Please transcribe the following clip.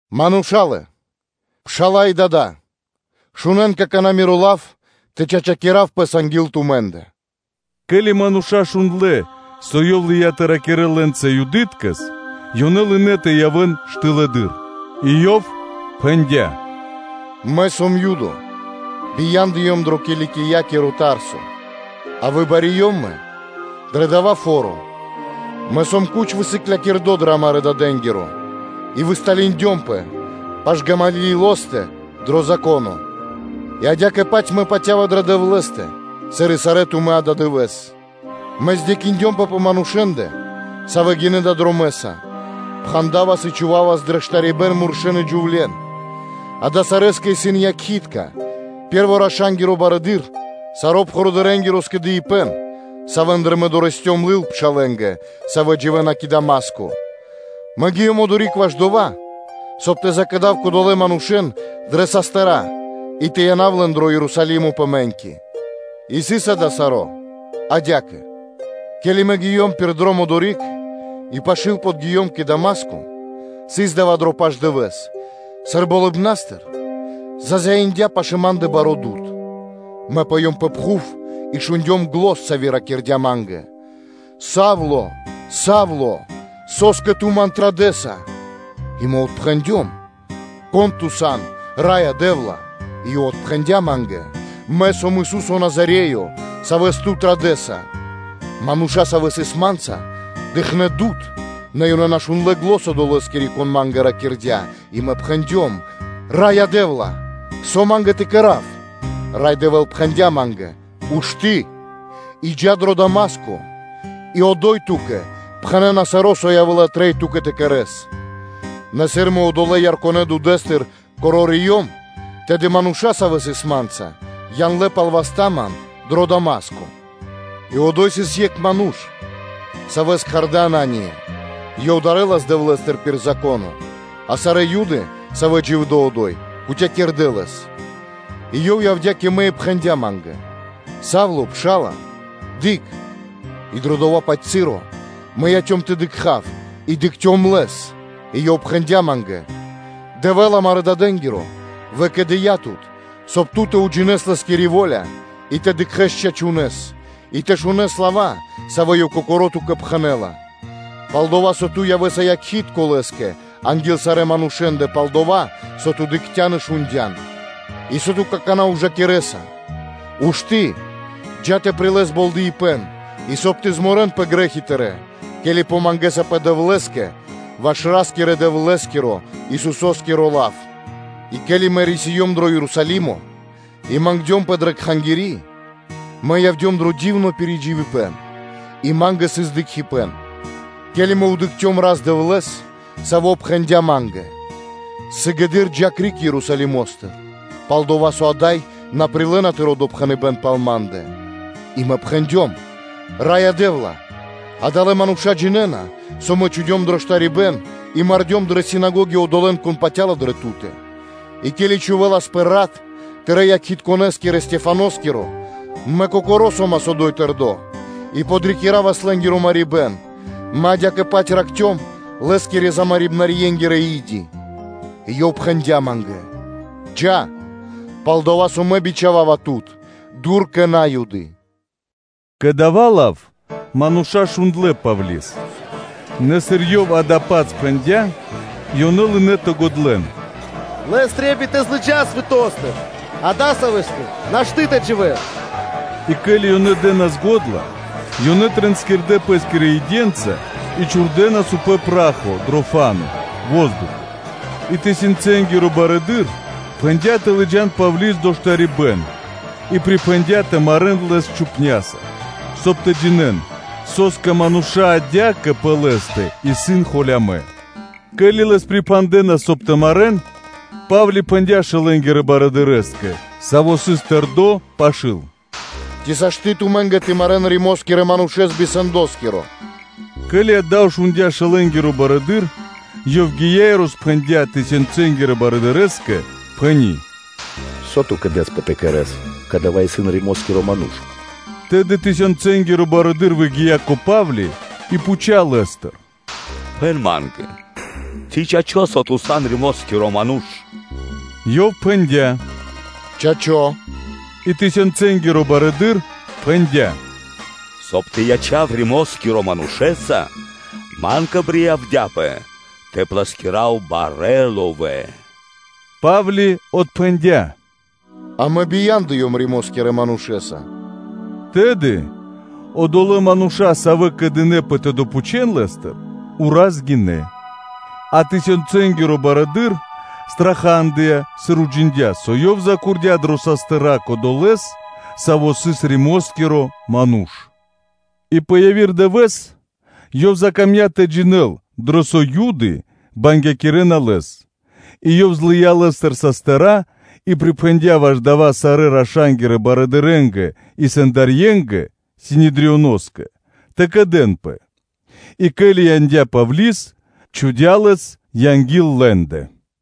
“Мурша́лэ, пшала́лэ, дадолэ! Шунэ́н какана́ миро лав тэ чачакирав (тэ опрадынав) пэс анги́л тумэ́ндэ.” Ке́ли мануша́ шундлэ́, со ёв лыя́ тэ ракирэ́л лэ́нца Юдыткэс, ёнэ лынэ́ тэ явэ́н штылэдыр. И ёв пхэндя́: “Мэ сом Юдо, бияндыём дро Киликиякиро Тарсо, а выбариём мэ дрэ дава́ фо́ро, мэ сом лачхэ́с высыклякирдо дрэ амарэ́ дадэ́нгиро и высталиндёмпэ пашы́л Гамалиилостэ дро Зако́но, и адя́кэ-паць мэ патя́ва дрэ Дэвлэ́стэ, сыр и сарэ́ тумэ́ ададывэ́с; мэ кэрдём бипатыв (здекиндёмпэ) пэ манушэ́ндэ, савэ́ гинэ́ далэ́ дромэ́са, пхандавас и чхувавас дрэ штарибэ́н муршэ́н и джувле́н; дава́ сарэскэ исын якхи́тка, пэ́рво раша́нгиро барыдыро́, саро́ пхурыдырэнгиро скэдыибэ́н, савэ́ндыр мэ дорэсцём (лыём) лыл пшалэ́нгэ, савэ́ дживэ́на кэ Дама́ско, мэ гиём одори́к ваш дова́, соб (кай) тэ закэдав кодолэ́н манушэ́н дрэ састыра́ и тэ янав лэн дро Ерусалимо пэ мэ́ньки. И сыс дава́ саро́ адя́кэ: ке́ли мэ гиём пир дром одори́к и пашы́л подгиём кэ Дама́ско, сыс дава́ дро пашдывэс, сыр болыбна́стыр зазяиндя пашы́л ма́ндэ баро́ дуд (свэ́то). Мэ пыём пэ пхув и шундём зан, сави́ ракирдя́ ма́нгэ: “Са́вле, Са́вле! Со́скэ ту Ман традэса?” И мэ отпхэндём: “Кон Ту сан, Раё Дэ́вла?” И Ёв отпхэндя́ ма́нгэ: “Мэ сом Ису́со Назареё, Савэс ту традэса.” Мануша́, савэ́ сыс ма́нца, дыкхнэ́ свэ́то, нэ ёнэ на шундлэ́ зан Одолэскири, Кон ма́нгэ ракирдя́. И мэ пхэндём: “Раё Дэ́вла! Со ма́нгэ тэ кэра́в?” Рай Дэвэ́л пхэндя́ ма́нгэ: “Ушты́ и джа́ дро Дама́ско и одо́й ту́кэ пхэнэ́на саро́, со явэ́ла трэй ту́кэ тэ кэрэ́с.” Нэ сыр мэ одолэ́ ярконэ дудэ́стыр корориём, тэды мануша́, савэ́ сыс ма́нца, яндлэ́ пал васт ман дро Дама́ско. И одо́й сыс екх ману́ш, савэ́с кхардэ́ Анания, ёв дарэлас Дэвлэ́стыр пир Зако́но, а сарэ́ Юды, савэ́ дживдэ́ одо́й, кутякирдэ лэс, и ёв явдя́ кэ мэ и пхэндя́ ма́нгэ: “Са́вле, Пша́ла, дыкх!” И дрэ дова́-паць часо (моменто), мэ яцём тэ дыкха́в и дыкхцём лэс. И ёв пхэндя́ ма́нгэ: “Дэвэ́л амарэ́ дадэ́нгиро выкэдыя́ тут, соб (кай) ту тэ уджинэс Лэ́скири во́ля и тэ дыкхэ́с чачунэ́с и тэ шунэ́с лава́, савэ́ Ёв кокоро́ ту́кэ пхэнэ́ла, пал-дова́ со ту явэ́са якхи́тко Лэ́скэ анги́л сарэ́ манушэ́ндэ пал дова́, со ту дыкхця́н и шундя́н. И со ту какана́ ужакирэса? Ушты́, джа́ тэ прилэс болдэипэн, и соб (кай) тэ морэнпэ криг грэ́хи тырэ́, ке́ли помангэсапэ Дэвлэ́скэ ваш Ра́скирэ-Дэвлэ́скиро, Исусо́скиро лав.” И ке́ли мэ рисиём дро Ерусалимо и мангдёмпэ дрэ Кхангири́, мэ явдём дро дивно пиридживибэн и ма́нгэ сыс дыкхибэ́н, ке́ли мэ дыкхцём Рас-Дэвлэ́с, Саво́ пхэндя́ ма́нгэ: “Сыгэды́р джа́ криг Ерусалимо́стыр, пал-дова́ со ада́й на прилэ́на тыро́ допхэныбэ́н пал Ма́ндэ.” И мэ пхэндём: “Раё Дэ́вла! Адалэ́ мануша́ джинэ́на, со мэ чхудём дро штарибэ́н и мардём дрэ синагоги одолэ́н, кон патя́ла дрэ Ту́тэ; и ке́ли чхувэласпэ рат тырэ́-якхитконэскирэ Стехваноскиро, мэ кокоро́ одо́й со́мас тэрдо́, и подрикиравас лэ́скиро марибэ́н, мэ адя́кэ-паць ракхцём лэ́скирэ – умарибнарьенгирэ и́ди.” И Ёв пхэндя́ ма́нгэ: “Джа́, пал-дова́ со Мэ бичхава́ва тут дур кэ На́юды.” Кэ дава́ лав мануша́ шундлэ́ Павли́с, нэ сыр ёв адя́кэ пхэндя́, ёнэ лынэ́ тэ годлэн: “Лэс трэй тэ злыджас свэто́стыр, адасавэскэ нашты́ тэ дживэ́л.” И ке́ли ёнэ дэ́нас го́дла, ёнэ тринскирдэ пэ́скирэ иденца и чхурдэнас упрэ́ пра́хо дро фа́но (воздухо). И тысёнцэнгиро барыдыро́ пхэндя́ тэ лыджа́н Павли́с дро штарибэ́н и припхэндя́ тэ марэ́н лэс чхупняса, соб (кай) тэ джинэ́н, со́скэ мануша́ адя́кэ пэ лэ́стэ исын холямэ́. Ке́ли лэс припхандэнас, соб (кай) тэ марэ́н, Па́вли пхэндя́ шэлэнгирэ барыдырэ́скэ, саво́ сыс тэрдо́ пашы́л: “Ци сашты́ тумэ́нгэ тэ марэ́н Римо́скирэ манушэ́с би сэндоскиро?” Ке́ли дава́ шундя́ шэлэнгиро барыдыро́, ёв гия́ и роспхэндя́ тысёнцэнгирэ барыдырэ́скэ, пхэни́: “Со ту кэдэсапэ тэ кэрэ́с? Кадава́ исын Римоскиро ману́ш.” Тэды тысёнцэнгиро барыдыро́ выгия́ кэ Па́вли и пхуця́ лэ́стыр: “Пхэн ма́нгэ, ци чачо́, со ту сан Римоскиро ману́ш?” Ёв пхэндя́: “Чачо́.” И тысёнцэнгиро барыдыро́ пхэндя́: “Соб (кай) тэ ячав Римо́скирэ манушэ́са, ма́нгэ приявдяпэ тэ плэскирав барэ́ ловэ́.” Па́вли отпхэндя́: “А мэ бияндыём Римо́скирэ манушэ́са.” Тэды одолэ́ мануша́, савэ́ кэдынэпэ тэ допхучэн лэ́стыр, ураз гинэ́; а тысёнцэнгиро барыдыро́ страхадыя, сыр уджиндя́, со ёв запхандя дрэ састыра́ кодолэ́с, саво́ сыс Римоскиро ману́ш. И пэ яви́р дывэ́с, ёв закамдя́ тэ джинэ́л, дрэ со Юды бангякирэнас лэс и ёв злыя́ лэ́стыр састыра́ и припхэндя́ ваш дава́ сарэ́ раша́нгирэ барылырэнгэ и сэндарьенгэ (Синедрионоскэ) тэ скэдэ́нпэ, и ке́ли яндя́ Павли́с, чхудя́ лэс анги́л лэ́ндэ.